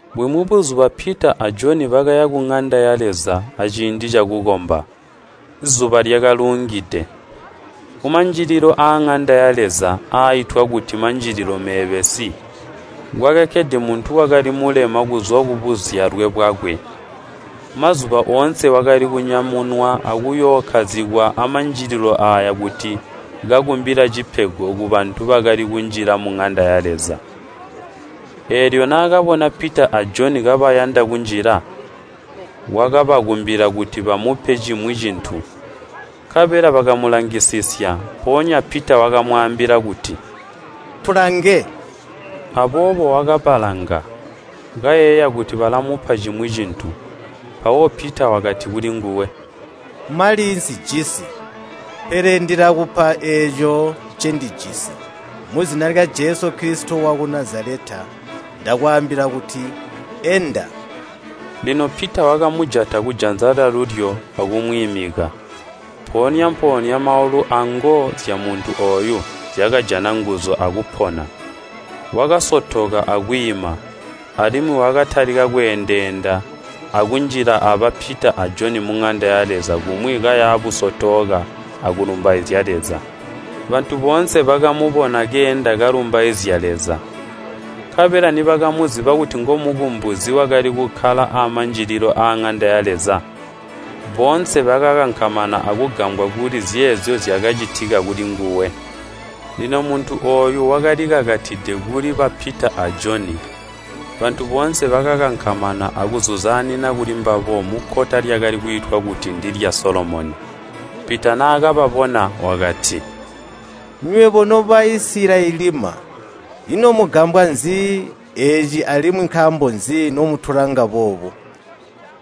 Bumwi buzuba Pita a Joni bakaya kuŋanda ya Leza aciindi cakukomba. Zuba lyakaluungide. Kumanjililo aaŋanda ya Leza aaitwa kuti “Manjililo Meebesi,” kwakakkede muntu wakali mulema kuzwa kubuzyalwe bwakwe. Mazuba oonse wakali kunyamunwa akuyookkazikwa amanjililo aaya kuti kakumbila cipego kubantu bakali kunjila muŋanda ya Leza. Eelyo naakabona Pita a Joni kabayanda kunjila, wakabakumbila kuti bamupe cimwi cintu. Nkabela bakamulangisisya, mpoonya Pita wakamwaambila kuti, “Tulange!” Aboobo wakabalanga, kayeeya kuti balamupa cimwi cintu. Mpawo Pita wakati kulinguwe, “Mali nsijisi, pele ndilakupa eeco ncendijisi. Muzina lya Jesu Kilisito waku Nazaleta ndakwaambila kuti, ‘Enda!’” Lino Pita wakamujata kujanza lyalulyo akumwiimika. Mpoonya-mpoonya maulu ango zyamuntu ooyo zyakajana nguzu akupona. Wakasotoka akwiima, alimwi wakatalika kweendeenda akunjila aba Pita a Joni muŋanda ya Leza kumwi kaya busotooka akulumbaizya Leza. Bantu boonse bakamubona keenda kalumbaizya Leza. Nkabela nibakamuziba kuti ngomukumbizi wakali kukkala amanjililo aaŋanda ya Leza, boonse bakakankamana akugambwa kuli zeezyo zyakacitika kulinguwe. Lino muntu ooyu wakalikakatide kuli ba Pita a Joni. Bantu boonse bakakankamana akuzuzaanina kulimbabo mukkota lyakali kwiitwa kuti ndilya Solomoni. Pita naakababona, wakati, “Nywebo no Baisilayelima, ino mugambwa nzi eeci alimwi nkaambo nzi nomutulanga boobu?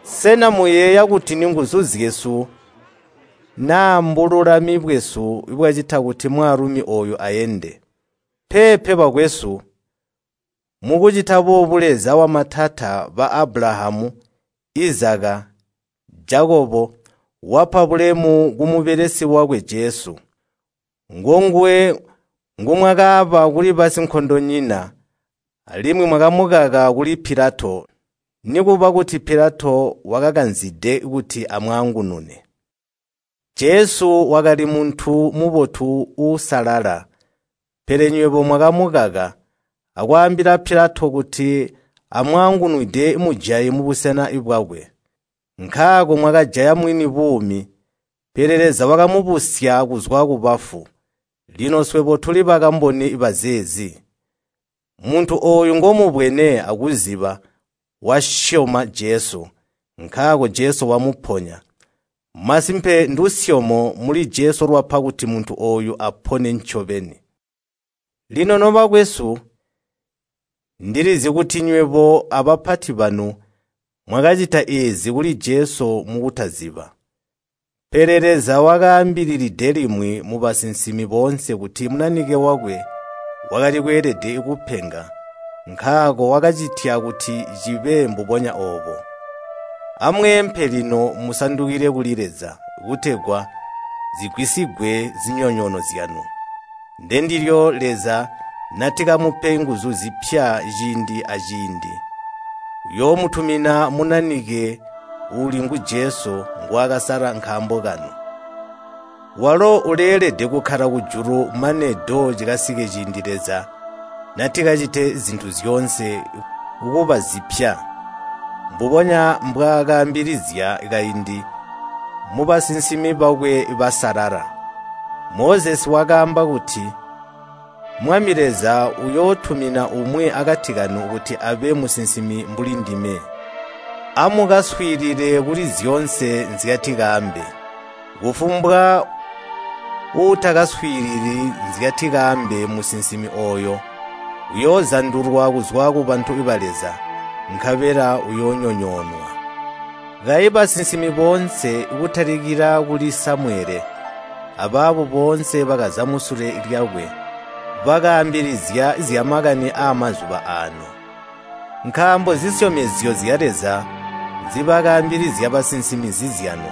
Sena muyeeya kuti ninguzu zyesu naa mbululami bwesu bwacita kuti mwaalumi ooyu aende? Peepe bakwesu, mukucita boobu Leza wamatata ba Abulahamu, Izaka, Jakobo, wapa bulemu kumubelesi wakwe Jesu. Ngonguwe ngumwakaaba kuli basinkondonyina, alimwi mwakamukaka kuli Pilato, nikuba kuti Pilato wakakanzide kuti amwaangunune. Jesu wakali muntu mubotu uusalala, pele nywebo mwakamukaka, akwaambila Pilato kuti amwaangunwide mujayi mubusena bwakwe. Nkaako mwakajaya Mwini buumi, pele Leza wakamubusya kuzwa kubafu. Lino swebo tuli bakamboni bazeezi. Muntu ooyu ngomubwene akuziba wasyoma Jesu, nkaako Jesu wamuponya. Masimpe ndusyomo muli Jesu lwapa kuti muntu ooyu apone ncobeni. “Lino nobakwesu, ndilizi kuti nywebo abapati banu mwakacita eezi kuli Jesu mukutaziba. Pele Leza wakaambilide limwi mubasinsimi boonse kuti Munanike wakwe wakali kweelede kupenga, nkaako wakacitya kuti cibe mbubonya oobo. Amweempe lino musandukile kuli Leza, kutegwa zigwisigwe zinyonyoono zyanu. Ndendilyo Leza natikamupe nguzu zipya ciindi aciindi, uyoomutumina Munanike uuli ngu Jesu, ngwaakasala nkaambo kanu. Walo uleelede kukkala kujulu mane do cikasike ciindi Leza natikacite zintu zyoonse kuba zipya, mbubonya mbwaakaambilizya kaindi mubasinsimi bakwe basalala. Mozesi wakaamba kuti, ‘Mwami Leza uyootumina umwi akati kanu kuti abe Musinsimi mbuli ndime. Amukaswiilile kuli zyoonse nzyatikaambe. Kufumbwa uutakaswiilili nzyatikaambe musinsimi ooyo, uyoozandulwa kuzwa kubantu ba Leza, nkabela uyoonyonyoonwa.’ Kayi basinsimi boonse kutalikila kuli Samuyele, abaabo boonse bakaza musule lyakwe, bakaambilizya zyamakani aamazuba aano. Nkaambo zisyomezyo zya Leza nzibakaambilizya basinsimi nzizyanu,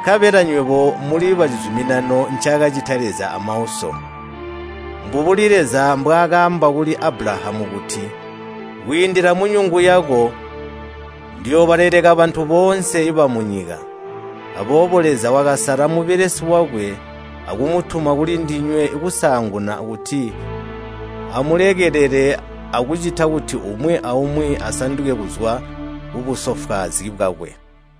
nkabela nywebo muli bacizuminano ncaakacita Leza amauso. Mbubuli Leza mbwaakaamba kuli Abulahamu kuti, ‘Kwiindila munyungu yako ndiyoobaleleka bantu boonse bamunyika.’ Aboobo Leza wakasala Mubelesi wakwe akumutuma kulindinywe kusaanguna kuti amulekelele akucita kuti umwi aumwi asanduke kuzwa kubusofwaazi bwakwe.”